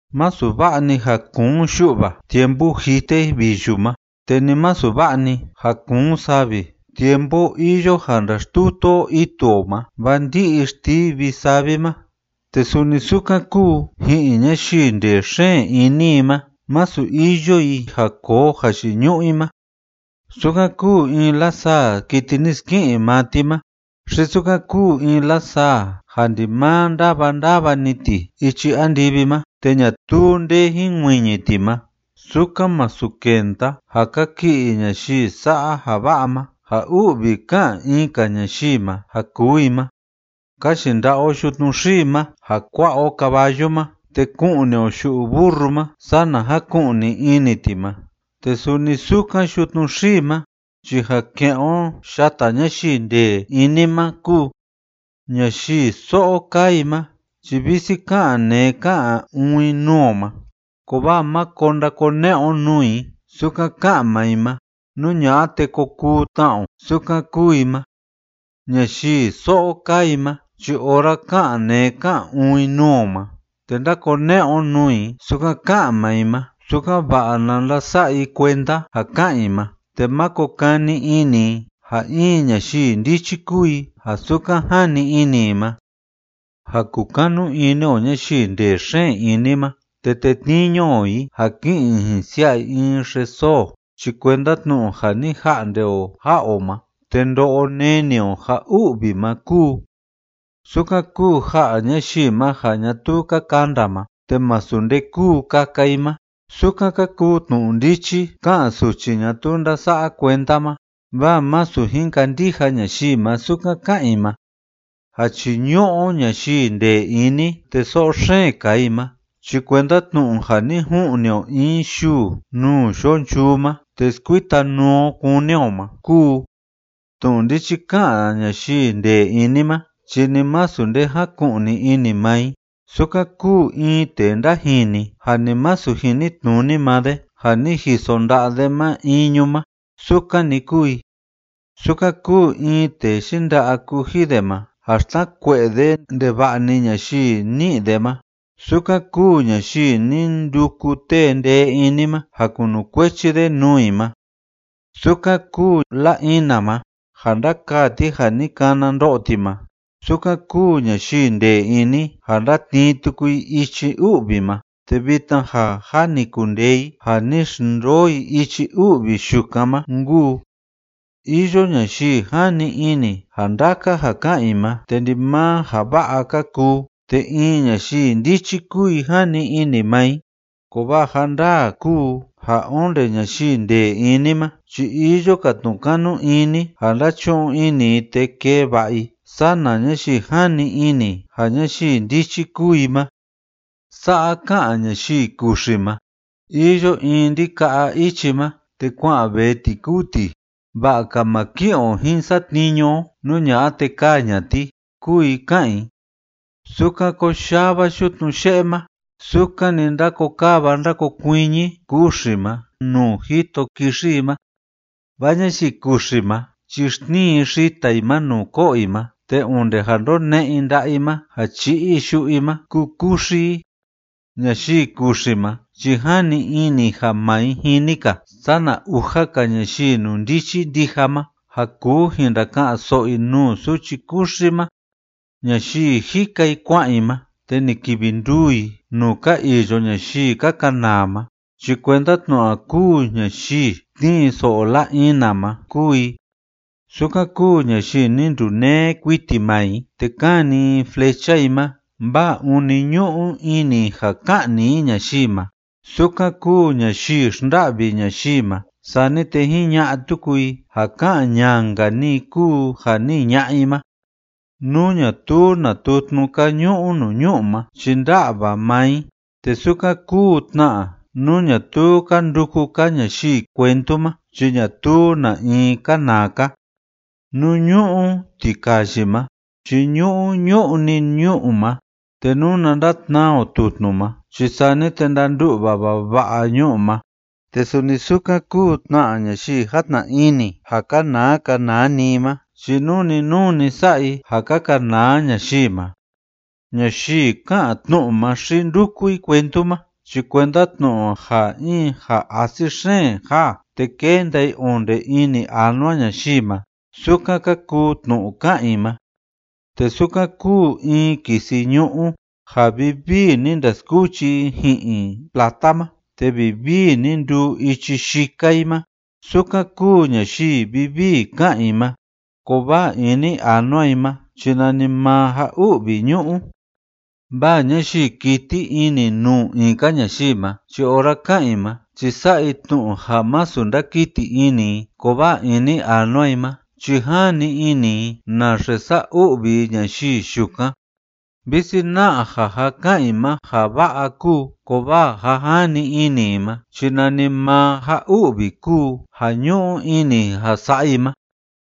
Masu va'a‑ni ja kuun yu'va tiempu jite viyu ma, te ni masu va'a‑ni ja kuun savi tiempu iyo ja ndaxtutu o itu o ma, vaa ndi'i xtivi savi ma, te suni sukan kúu ji'in ñayii ndee xeen ini i ma, masu iyo i ja koo jayiñu'u i ma. Sukan kúu in lasaa kiti ni ski'in maa ti ma, xi sukan kúu in lasaa ja ndimaa ndava ndava‑ni ti ichi andivi ma te ñatuu nde jinkuiñi ti ma, sukan másu kenda ja kaki'i ñayii sa'a ja va'a ma ja u'vi ká'an in‑ka ñayii ma ja kuu i ma. Ka yinda'a o yutnu xii ma ja kua'a o caballu ma, te ku'ni o yu'u burru ma sana jaku'ni ini ti ma, te suni sukan yutnu xii ma chi ja ke'en o yata ñayii ndee ini ma kúu. Ñayii so'o kaa i ma chi visi ká'an neé ká'an uun i nuu o ma, kovaa máko ndakone'e o nuu i sukan ká'an maa i ma. Nú ña'a te ko kuu tna o sukan kúu i ma. Ñayii so'o kaa i ma chi ora ká'an neé ká'an uun i nuu o ma, te ndákone'e o nuu i sukan ká'an maa i ma, sukan‑va'a na ndasa'a i kuenda ja ká'an i ma te máko kani ini i ja in ñayii ndichi kúu i ja sukan jani ini i ma. Ja kukanu ini o ñayii ndee xeen ini ma te tetniñu o i ja ki'in i jin xsia'a i in xesoo chi kuenda tnu'u ja ni ja'nde o ja'a o ma te ndo'o neni o ja u'vi ma kúu. Sukan kúu ja'a ñayii ma ja ñatuu ka kanda ma te masu nde kúu kaka i ma, sukan ka kuu tnu'u ndichi ká'an suchi ñatuu ndása'a kuenda ma, vaa masu jin kandija ñayii ma sukan ká'an i ma. Ja chíñu'u o ñayii ndee ini te so'o xeen kaa i ma chi kuenda tnu'u ja ni ju'ni o in yuu nuu yo'o nchuu ma te skuita nuu o kúni o ma kúu. Tnu'u ndichi ká'an ñayii ndee ini ma chi ni masu nde jáku'ni ini maa i, sukan kúu in tee ndajini ja ni masu jinitnuni maa de ja ni jiso nda'a de ma iñu ma, sukan‑ni kúu i. Sukan kúu in tee yinda'a kuji de ma ja xtnakue'e de ndeva'a‑ni ñayii ní'i de ma, sukan kúu ñayii ni nduku tee ndee ini ma ja kunukuechi de nuu i ma. Sukan kúu la‑ina ma ja ndákaa ti ja ni kana ndo'o ti ma, sukan kúu ñayii ndee ini ja ndátnii tuku i ichi u'vi ma, te vitna ja jâ ni kundee i ja ni xndoo i ichi u'vi yukan ma nkuu. Iyo ñayii jani ini ja ndaka ja ká'an i ma te ndimaa ja va'a ka kuu te in ñayii ndichi kúu i jani ini maa i, kovaa ja ndaa kúu ja onde ñayii ndee ini ma chi iyo‑ka tnu'u kanu ini ja ndachu'un ini i te kee va'a i sana ñayii jani ini ja ñayii ndichi kúu i ma. Sa'a ká'an ñayii kuxi ma: “Iyo in ndika'a ichi ma te kua'an vee ti kúu ti, va'a‑ka ma ki'in o jin satniñu o, nú ña'a te ka'ni ña'a ti”, kúu i ká'an i. Sukan koyava yutnu ye'e ma sukan‑ni ndákokava ndákokuiñi kuxi ma nuu jito kixi i ma. Vaa ñayii kuxi ma chi xtnii i xita i ma nuu ko'o i ma, te onde ja ndone'e i nda'a i ma ja chi'i i yu'u i ma ku‑kuxi i. Ñayii kuxi ma chi jani ini i ja maa i jini‑ka sana uja‑ka ñayii inundichi ndija ma ja kuu jin ndaka'an‑so'o i nuu suchi kuxi ma. Ñayii jika i kua'an i ma te ni kivi nduu i nuu ka iyo ñayii ka kanaa ma chi kuenda tnu'u ja kúu ñayii tnii so'o la‑ina ma kúu i. Sukan kúu ñayii ni nduneé kuiti maa i te kani i flecha i ma vaa ûni ñu'u ini i ja ka'ni i ñayii ma, sukan kúu ñayii xnda'vi ñayii ma sani te jiña'a tuku i ja ká'an ñanka‑ni i kúu ja ni jiña'a i ma. Nú ñatuu na tutnu‑ka ñu'u nuu ñu'u ma chi ndá'va maa i, te sukan kúu tna nú ñatuu ka nduku‑ka ñayii cuentu ma chi ñatuu na in kánaa‑ka. Nú ñu'u tikayi ma chi ñu'u ñu'u‑ni ñu'u ma, te nuna ndatnaa o tutnu ma chi sani te ndandu'va vava'a ñu'u ma, te suni sukan kúu tna ñayii játna ini ja kanaa kanaa‑ni i ma chi nuu‑ni nuu‑ni sa'a i ja ka kanaa ñayii ma. Ñayii ká'an tnu'u ma xi ndúku i cuentu ma chi kuenda tnu'u ja in ja asi xeen jaa te kenda i onde ini anua ñayii ma, sukan ka kuu tnu'u ká'an i ma, te sukan kúu in kisi ñu'ú ja vivii ni ndaskuchi i ji'in plata ma te vivii ni nduu ichi yika i ma, sukan kúu ñayii vivii ká'an i ma, kovaa ini anua i ma chi nanimaa ja u'vi ñu'u. Vaa ñayii kiti ini nuu in‑ka ñayii ma chi ora ká'an i ma chi sa'a i tnu'u ja masu ndákiti ini i, kovaa ini anua i ma chi jani ini i naxe sa'a u'vi i ñayii yukan. Visi na'a ja ja ká'an i ma ja va'a kúu, kovaa ja jani ini i ma chi nanimaa ja u'vi kúu ja ñu'u ini i ja sa'a i ma.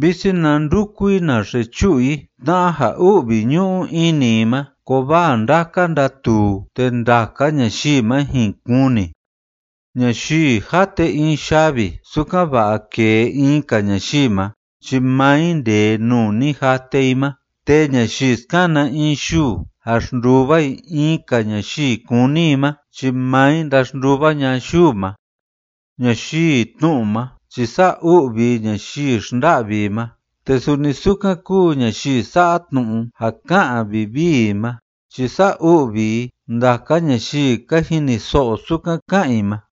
Visi na nduku i naxe chu'u i tna'a ja u'vi ñu'u ini i ma, kovaa ndaka ndatuu, te ndaka ñayii ma jin kuni. Ñayii jate in yavi sukan‑va'a kêe in‑ka ñayii ma chi maa i ndêe nuu ni jate i ma, te ñayii skana in yuu ja xnduva i in‑ka ñayii kúni i ma, chi maa i ndaxnduva ña'a yuu ma. Ñayii tnu'u ma chi sa'a u'vi i ñayii xnda'vi i ma, te suni sukan kúu ñayii sa'a tnu'u ja ká'an vivii i ma chi sa'a u'vi i ndaka ñayii ka jiniso'o sukan ká'an i ma.